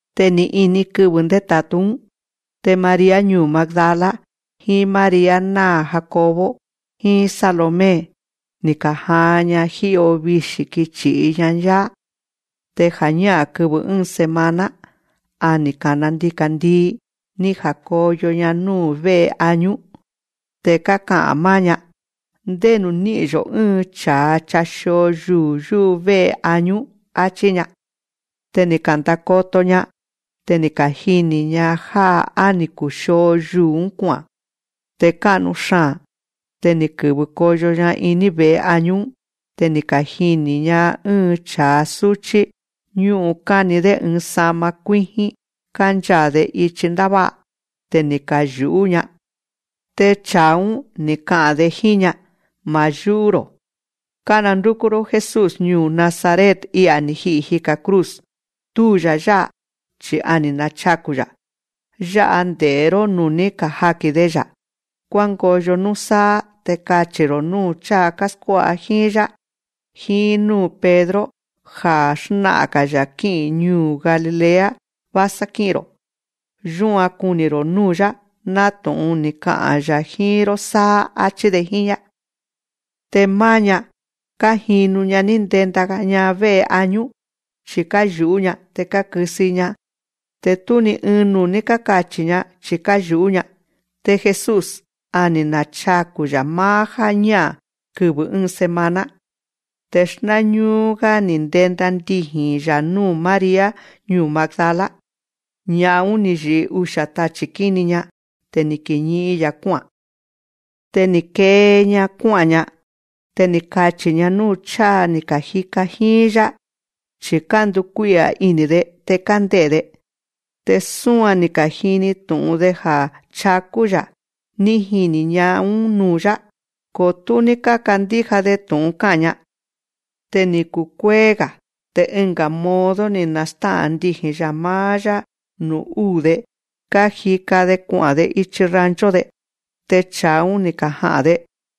Te ni̱ ini kɨvɨ̱ ndéta̱tú‑ún. Te María ñuu̱ Magdala, jíín María náa̱ Jacobo, jíín Salomé, ni̱ ka̱jaan‑ña jí'o vixi̱ kichi̱'i‑ña‑yá. Te ja̱ñá'a̱n kɨvɨ̱ ɨ́ɨn semana, ja̱ á ni̱ kana ndika̱ndii, ni̱ ja̱koyo‑ña núu̱ vé'e añú. Te káka'a̱n máá‑ña: Ndénu̱ ní'i̱n‑yo̱ ɨ́ɨn cha̱a chaxio yuu̱ yúvé'e añú, áchí‑ña. Te ni̱ ka̱ndakoto‑ña. Te ni̱ kajini̱‑ña já á ni̱ kuxio yuu̱‑ún kua'a̱n. Te ká'nu xaa̱n. Te ni̱ kɨ̱vɨ koyo‑ña iní ve̱'e añú‑ún. Te ni̱ kajini̱‑ña ɨ́ɨn cha̱a súchí, ñú'un káni‑dé ɨɨn sa'ma kuíjín, kánchaa̱‑de ichi ndává'a. Te ni̱ kayu̱'ú‑ña. Te cha̱a‑ún, ni̱ ka'a̱n‑de jíín‑ña: Ma̱ yú'ú‑ro̱. Kánandúkú‑ró Jesús ñuu̱ Nazaret I'a̱ ni̱ ji'i̱ jika̱ cruz. Túu‑ya̱ yá'a, chi̱ a ni̱ nachaku̱‑ya̱. Yá'a nde̱'é‑ró nú ní kajaki̱n‑de‑ya̱. Kuángoyo núsáá, te kachi̱‑ro̱ núu̱ cháa káskuá'a jíín‑yá, jíín núu̱ Pedro, ja̱ xná'a̱n‑ga̱‑ya̱ kí'i̱n ñuu̱ Galilea vásá kí'i̱n‑ro̱. Yúan kuni̱‑ro̱ núu̱‑yá, nátu̱'un ni̱ ka'a̱n‑ya̱ jíín‑ró sáá, áchí‑de jíín‑ña. Te máá‑ña, kájinu‑ña ní ndenda‑ña vé'e añú. Chi̱ káyu̱'ú‑ña, te kákɨsɨ‑i‑ña. Te tú ni ɨɨn nuu̱ ní kákachi̱‑ña, chi̱ káyu̱'ú‑ña. Te Jesús, a ni̱ nachaku̱‑ya̱ máá jáñá'a̱n kɨvɨ̱ ɨ́ɨn semana. Te xnáñúú‑gá ni̱ ndenda ndiji̱n‑ya̱ núu̱ María ñuu̱ Magdala. Ña'an‑ún, ni̱ yi̱'i usia̱ tachi̱ kíni‑ña. Te ni̱ kiñi'in‑ya̱ kuá'a̱n. Te ni̱ kee‑ña kuá'a̱n‑ña. Te ni̱ kachi̱‑ña núu̱ cháa ni̱ ka̱jika jíín‑yá, chi̱ kándukuí'a̱ ini̱‑de te kánde'e̱‑de. Te súan ni̱ ka̱jini tu̱'un‑de ja̱ chakú‑ya̱ ní jini̱ ña'an‑ún nuu̱‑yá. Ko tú ní kákandíja‑de tu̱'un ká'a̱n‑ña. Te ni̱ kuee̱‑ga̱. Te ɨnga̱ modo ni̱ nastá'a̱n ndiji̱n‑ya̱ máá‑yá nuu̱ úu̱‑de kájika‑de kua'a̱n‑de ichi rancho‑de. Te cha̱a‑ún, ni̱ kaja'a̱n‑de.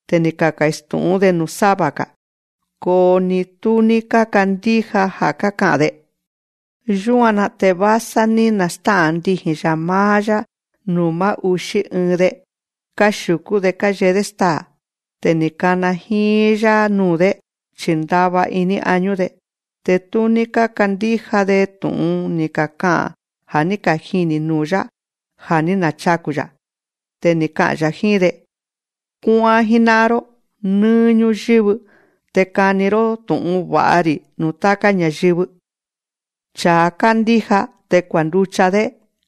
Te ni̱ kastu̱'ún‑de nuu̱ sáva‑ga̱. Ko ni tú ní kákandíja ja̱ káka'a̱n‑de. Yúan‑na te vásá ní nastá'a̱n ndiji̱n‑ya̱ máá‑yá nuu̱ máá uxí ɨɨn‑de, káxiu̱kú‑de káyee‑dé staa̱. Te ni̱ kana jíín‑yá nuu̱‑dé, chi̱ ndava iní añú‑de, te tú ní kákandíja‑de tu̱'un ni̱ kaka'a̱n ja̱ ní kajini̱ nuu̱‑yá ja̱ ní nachaku̱‑ya̱. Te ni̱ ka'a̱n‑ya̱ jíín‑de: Kuá'án jíná'an‑ró nɨ́ɨ́ ñúyɨ́vɨ, te kani‑ró tú'un va̱'a‑ri̱ nuu̱ táká ña̱yɨvɨ. Cha̱a kándíja te kuanducha‑dé,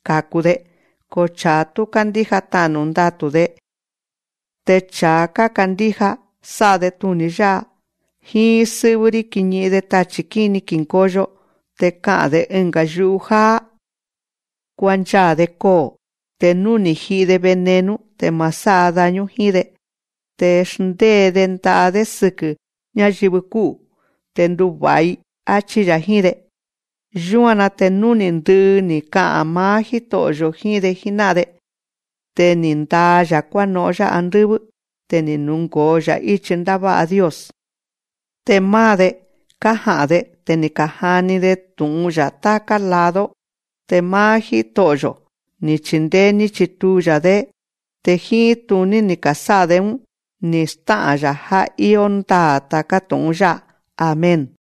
ka̱ku‑de. Ko cha̱a tú kándíja, ta'nu̱ ndatu̱‑de. Te cha̱a kákandíja, sá'a‑de tuni̱ yá'a: Jíín sɨ́'vɨ́‑rí kiñi'in‑de tachi̱ kíni ki̱ngoyo. Te ka'a̱n‑de ɨnga̱ yu'u jáá. Kuanchaa̱‑de koo̱, te nú ni̱ ji'i‑de veneno, te ma̱ sá'a daño jíín‑de. Te xndée‑de nda'a‑dé sɨkɨ̱ ñáyɨvɨ kú'u̱, te nduva̱'a‑i, áchí‑ya̱ jíín‑de. Yúan‑na te nuu̱ ní ndɨ'ɨ ni̱ ka'a̱n máá Jíto'o̱‑yo̱ jíín‑de jíná'an‑de, te ni̱ ndaa‑ya̱ kuáno'on‑yá andɨ́vɨ́. Te ni̱ nungo̱o‑ya̱ íchi ndává'a Dios. Te máá‑de, kája'a̱n‑de. Te ni̱ ka̱jani‑de tu̱'un‑ya̱ táká lado. Te máá Jito'o̱‑yo̱, ni̱ chindéé ní chituu‑ya̱‑dé. Te jíín tuní ni̱ ka̱sá'a‑de‑ún ni̱ stá'a̱n‑ya̱ já íó ndaa̱ ta̱ká tu̱'un yá'a. Amén.